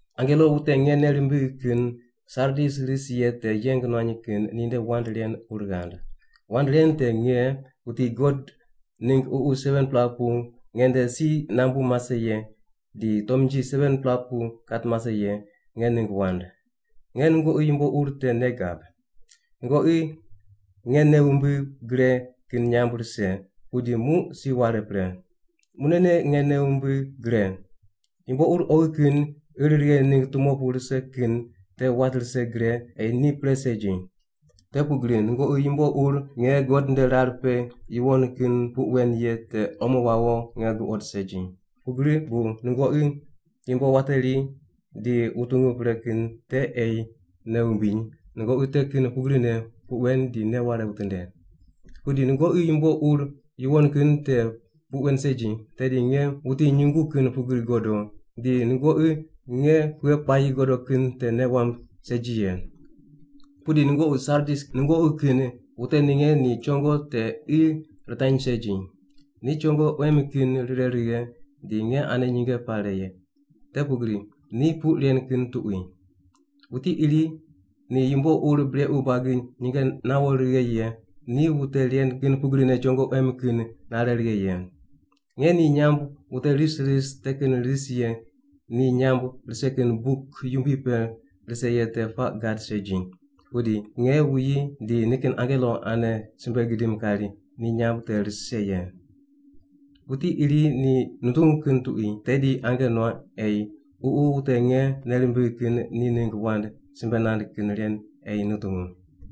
“Angelo wute nge nei rimbigh kin Sardis ris ye te yeng nuany kin ninde wand ren ur ghand: Wand ren te nge, wuti God ningg ququ 7-pela pu nge nde si nambu mase ye di tomnji 7-pela pu kat mase ye, nge ningg wand. Nge nungoqi yumbo ur te nei gab. Nungoqi nge nei wumbigh gre kin nyamb rise, pudi muq si ware pre. Munene nge nei wumbigh gre! Yumbo ur oghi kin ir righe ningg tumo pu rise kin te wat rise gre ei ni pre segi. Te pugri nungoqi yumbo ur nge God nde rar pe yuwon kin puq wen ye te omo wawo nge guqod segi. Pugri bu nungoqi yumbo wateri di wutungu pre kin te ei nei wumbiny, nungoqi te kin pugrine puq wen di nei ware witinde. Pudi nungoqi yumbo ur yuwon kin te puq wen segi, tedi nge wuti nyungu kin pugri godo di nungoqi nge pughe puayi godo kin te nei wamb segi ye. “Pudi nungoqi Sardis nungoqi kin wute ninge ni chongo te qi ritany segi. Ni chongo quem kin rire righe di nge ane nyinge pare ye, te pugri ni puq ren kin tuqui. Wuti iri ni yumbo ur brequ buagi nyinge nawo righe ye ni wute ren kin pugrine chongo quem kin nare righe ye. Nge ni nyamb wute ris ris te kin ris ye ni nyamb rise kin buk yumbui pe rise ye te puaq gad segi, pudi nge wuyi di nikin angelo ane simbe gidim kari ni nyamb te rise ye. “Wuti iri ni nutungu kin tuqui tedi ange nuaq ei Ququ wute nge nei rimbigh kin ni ningg wand simbe nand kin ren ei nutungu.”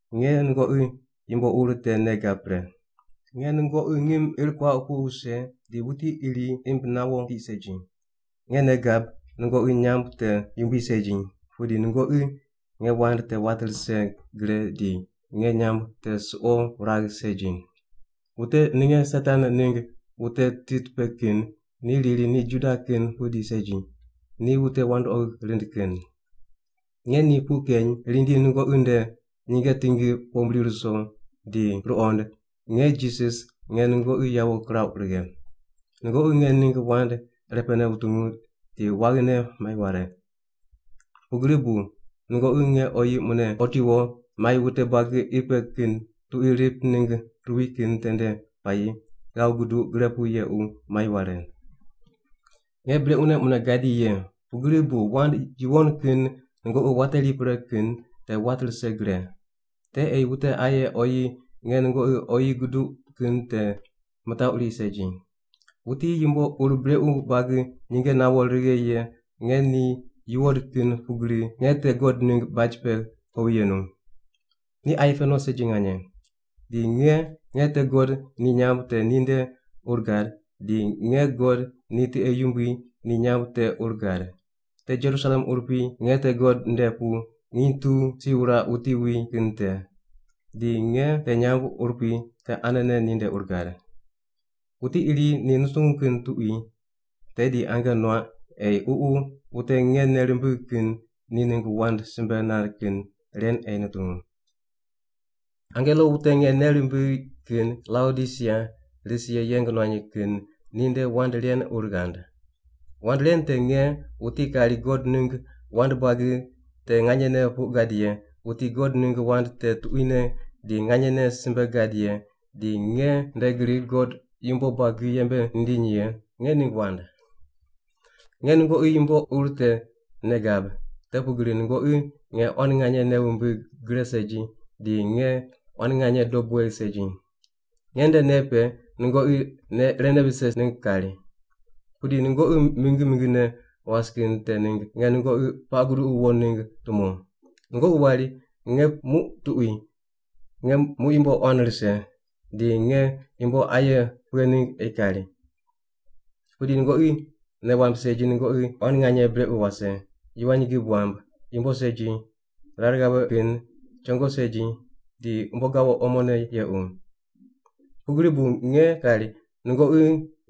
Nge nungoqi yumbo ur te nei gab pre. Nge nungoqi ngim ir kuauq pu wuse, di wuti iri imb nawo tiq segi. Nge nei gab nungoqi nyamb te yumbui segi, pudi nungoqi nge wand te wat rise gre di nge nyamb te suqo wuragh segi. Wute ninge Satan ningg wute tit pe kin ni riri ni Juda kin pudi segi, ni wute wandoqi rind kin. Nge ni puq keny rindi nungoqi nde nyinge tingi pombri ruso di ruqond nge Jisas nge nungoqi yawo kirauq righe. Nungoqi nge ningg wand irepene wutungu di waghine mai ware. Pugri bu muq nge oyi mune otiwo mai wute buagi qi pe kin tuqui rip ningg ruwi kin tende puayi ghav guduq gre pu yequ mai ware. “Nge brequne mune gadi ye, pugri bu wand yuwon kin nungoqi wateri pre kin te wat rise gre. Te ei wute aye oyi nge nungoqi oyi guduq kin te mitaquri segi. Wuti yumbo ur brequ buagi nyinge nawo righe ye nge ni yuwod kin pugri nge te God ningg baj pe kowi yenu. Ni aye pe no segi nganye. Di nge, nge te God ni nyamb te ninde ur gad, di nge God ni tiqe yumbui ni nyamb te ur gad. Te Jerusalem urupui nge te God nde pu nginy tu si wuraq wuti wi kin te. Di nge te nyamb urupui te anene ninde ur gad. “Wuti iri ni nutungu kin tuqui tedi ange nuaq ei Ququ wute nge nei rimbigh kin ni ningg wand simbe nand kin ren ei nutungu.” “Angelo wute nge nei rimbigh kin Laodisia ris ye yeng nuany kin ninde wand ren ur ghand: Wand ren te nge, wuti kari God ningg wand buagi te nganyene puq gad ye, wuti God ningg wand te tuquine di nganyene simbe gad ye di nge nde gri God yumbo buagi yembe nindiny ye, nge nde ningg wand. Nge nungoqi yumbo ur te nei gab, te pugri nungoqi nge quan nganye nei wumbig gre segi di nge quan nganye dob wegh segi. Nge nde nei pe nungoqi nei irene vise ningg kari. Pudi nungoqi mingi mingine was kin te ningg nge nungoqi puaq guduqu wo ningg tumo. Nungoqi wari, ‘Nge muq tuqui, nge muq yumbo quan rise, di nge yumbo aye pughe ningg ei kari.’ Pudi nungoqi nei wamb segi nungoqi quan nganye brequ wase, yivany gib wamb, yumbo segi, rar ghave kin, chongo segi, di umbo gawo omone yequ. Pugri bu nge kari, nungoqi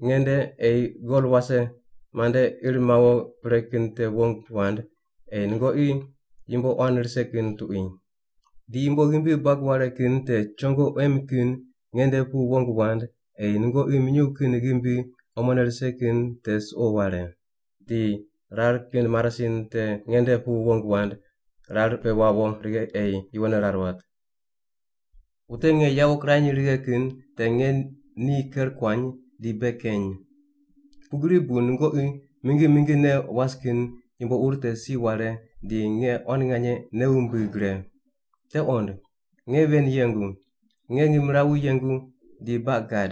nge nde ei gol wase mande ir mawo pre kin te wong wand, ei nungoqi yumbo quan rise kin tuqui. Di yumbo ghimbi buag ware kin te chongo quem kin nge nde pu wong wand, ei nungoqi minyuw kin ghimbi omone rise kin te suqo ware. Di rar kin marasin te nge nde pu wong wand rar pe wawo righe ei yuwonne rar wat. “Wute nge yawo kirany righe kin te nge ni ker kuany di bei keny. Pugri bu nungoqi mingi mingine was kin yumbo ur te si ware di nge quan nganye nei wumbigh gre. Te qond. Nge ven yengu. Nge ngimrawu yengu di baq gad.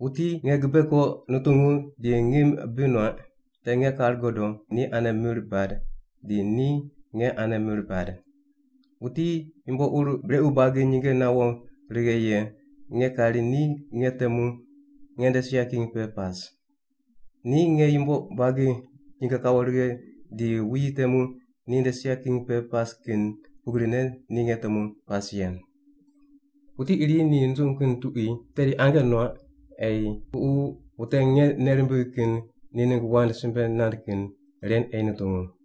Wuti nge gibe ko nutungu di ngim bi nuaq, te nge kar godo ni ane mir bad di ni nge ane mir bad. Wuti yumbo ur brequ buagi nyinge nawo righe ye nge kari ni nge temu nge nde sia king pe pas. Ni nge yumbo buagi nyinge kawo righe di wuyi temu ni nde sia king pe pas kin pugrine ni nge temu pas ye. “Wuti iri ni nutungu kin tuqui tedi ange nuaq ei Ququ wute nge nei rimbigh kin ni ningg wand simbe nand kin ren ei nutungu.”